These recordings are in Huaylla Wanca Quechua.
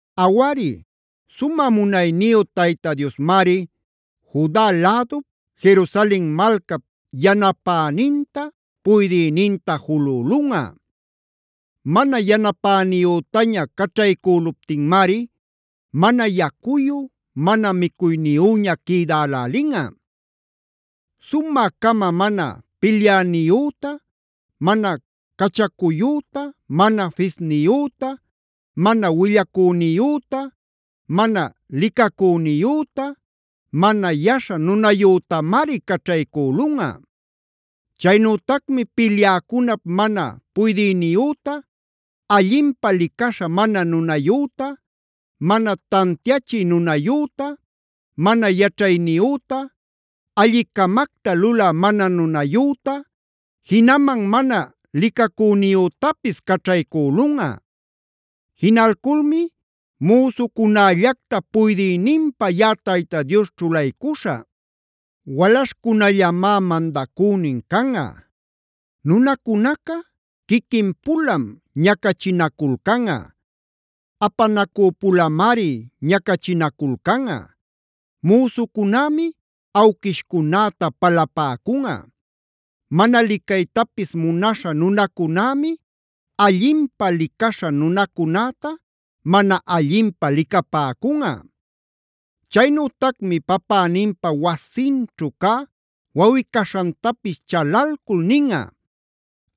Awari, sumä munayniyu Tayta Diosmari, Juda lädup, Jerusalen malcap yanapäninta, puydïninta julülunꞌa. Mana yanapäniyütaña caćhaycüluptinmari mana yacuyu, mana micuyniyüña quïdälälinꞌa. Sumä-cama mana pilyäniyüta, mana cachacuyüta, mana fisniyüta, mana willacüniyüta, mana licacüniyüta, mana yaśha nunayütamari caćhaycülunꞌa. Chaynütacmi pilyäcunap mana puydïniyüta, allinpä licaśha mana nunayüta, mana tantiachi nunayüta, mana yaćhayniyüta, allicamacta lulä mana nunayüta, jinaman mana licacüniyütapis caćhaycülunꞌa. Jinalculmi müsucunällacta puydïninpä yaꞌa Tayta Dios ćhulaycuśhä; walaśhchacunallamá mandacünin canꞌa. Nunacunaca quiquin-pulam ñacachinaculcanꞌa; apanacüpulamari ñacachinaculcanꞌa; müsucunämi awquishcunäta palapäcunꞌa; mana licaytapis munaśha nunacunämi allinpä licaśha nunacunäta mana allinpä licapäcunꞌa. Chaynütacmi papäninpa wasinćhu cä wawꞌi-caśhantapis chalalcul ninꞌa: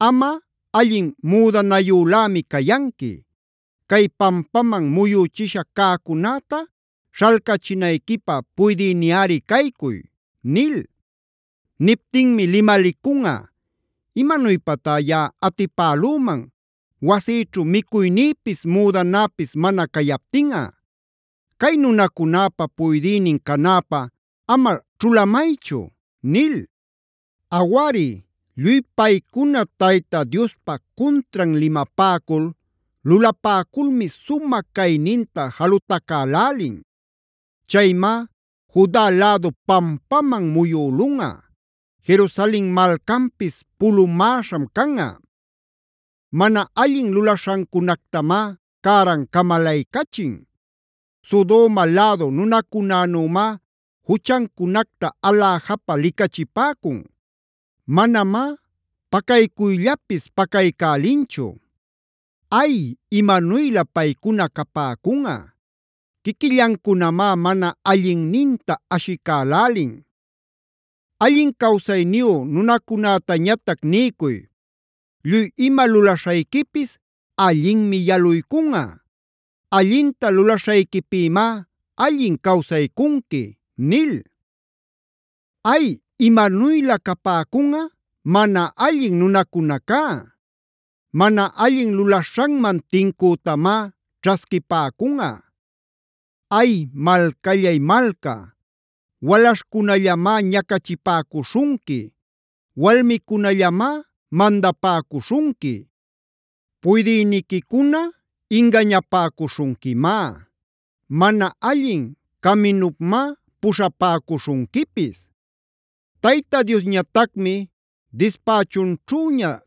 “Amꞌa allin müdanayülämi cayanqui. Cay pampaman muyüchisha cäcunäta śhalcachinayquipä puydïniꞌari caycuy” nil. Niptinmi limalicunꞌa: “¿Imanuypatá yaꞌa atipälüman wasïćhu micuynïpis, müdanäpis mana cayaptinꞌa? Cay nunacunäpa puydïnin canäpä ama ćhulamaychu” nil. Awari, lluy paycuna Tayta Diospa cuntran limapäcul, lulapäculmi sumä cayninta jalutacälälin. Chaymá Juda lädu pampaman muyülunꞌa; Jerusalen malcanpis pulumäśham canꞌa. Mana allin lulaśhancunactamá cäran camalaycachin. Sodoma lädu nunacunänümá juchancunacta aläjapä licachipäcun. Manamá pacaycuyllapis pacaycälinchu. ¡Ay, imanuylä paycuna capäcunꞌa! Quiquillancunamá mana allinninta ashicälälin. Allin cawsayniyu nunacunätañatac niycuy: “Lluy ima lulaśhayquipis allinmi yaluycunꞌa. Allinta lulaśhayquipïmá allin cawsaycunqui” nil. ¡Ay, imanuylä capäcunꞌa mana allin nunacunacá! Mana allin lulaśhanman tincütamá ćhasquipäcunꞌa. ¡Ay, malcallay malca! Walaśhcunallamá ñacachipäcuśhunqui; walmicunallamá mandapäcuśhunqui. Puydïniquicuna ingañapäcuśhunquimá; mana allin caminupmá puśhapäcuśhunquipis. Tayta Diosñatacmi dispächunćhüña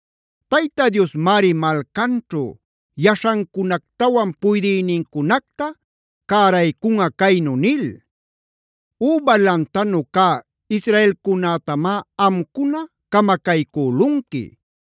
Tayta Diosmari malcanćhu yaśhancunactawan puydïnincunacta cäraycunꞌa caynu nil: “Üba lantanu cä israelcunätamá amcuna camacaycülunqui;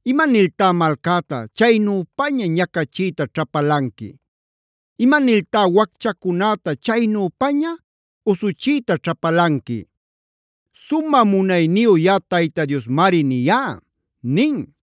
¿Imaniltá malcäta chaynüpaña ñacachiyta ćhapalanqui? ¿Imaniltá wacchacunäta chaynüpaña usuchiyta ćhapalanqui? Sumä munayniyu yaꞌa Tayta Diosmari niyá” nin.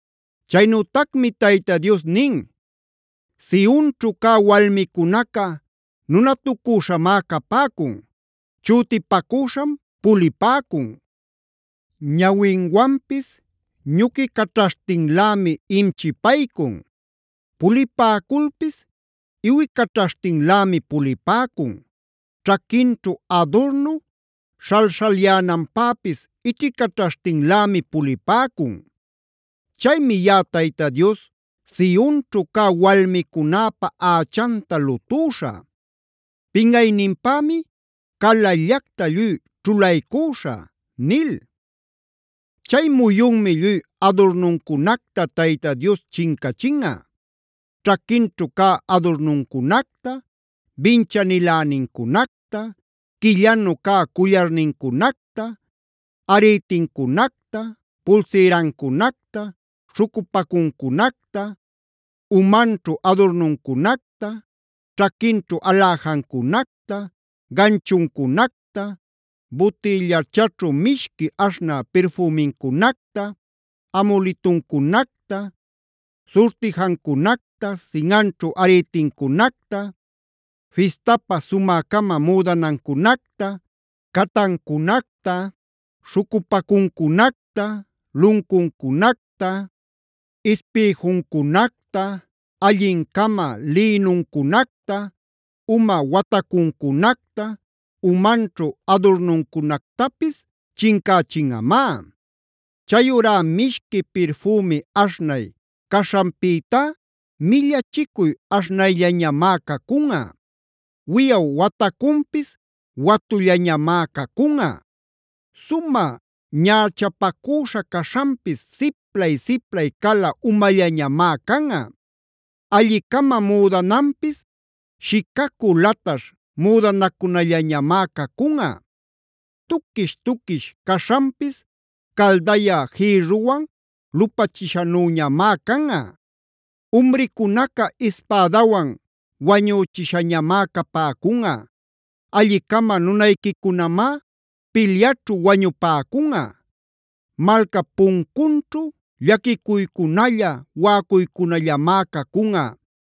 Chaynütacmi Tayta Dios nin: “Sionćhu cä walmicunaca nunatucüśhamá capäcun; chütipacüśham pulipäcun; ñawinwanpis ñuquicaćhaśhtinlämi imchipaycun; pulipäculpis iwicaćhaśhtinlämi pulipäcun, ćhaquinćhu adurnu śhalśhalyänanpäpis ićhicaćhaśhtinlämi pulipäcun. Chaymi yaꞌa Tayta Dios, Sionćhu cä walmicunäpa ächanta lutüśhä; pinꞌayninpämi calallactac lluy ćhulaycüśhä” nil. Chay muyunmi lluy adurnuncunacta Tayta Dios chincachinꞌa: ćhaquinćhu cä adurnucunacta, binchanilänincunacta, quillanu cä cullarnincunacta, arïtincunacta, pulsïrancunacta, śhucupacuncunacta, umanćhu adurnuncunacta, ćhaquinćhu aläjancunacta, ganchuncunacta, butillachaćhu mishqui aśhnä pirfümincunacta, amulituncunacta, surtijancunacta, sinꞌanćhu arïtincunacta, fistapä sumä-cama müdanancunacta, catancunacta, śhucupancunacta, luncuncunacta, ispïjuncunacta, allin-cama lïnuncunacta, uma watacuncunacta, umanćhu adurnuncunactapisd chincächinꞌamá. Chayurá mishqui pirfümi aśhnay caśhanpïtá millachicuy aśhnayllañamá cacunꞌa. Wiꞌaw watacunpis watullañamá cacunꞌa. Sumä ñächapacüśha caśhanpis siplay-siplay cala umallañamá canꞌa. Alli-cama müdananpis shicacü lataśh müdanacunallañamá cacunꞌa. Tuquish-tuquish caśhanpis caldaya jïrruwan lupachishanüñamáe canꞌa. Umricunaca ispädawan wañüchishañamá capäcunꞌa; alli-cama nunayquicunamá pilyaćhu wañupäcunꞌa. Malcap puncunćhu llaquicuycunalla, waꞌacuycunallamá cacunꞌa.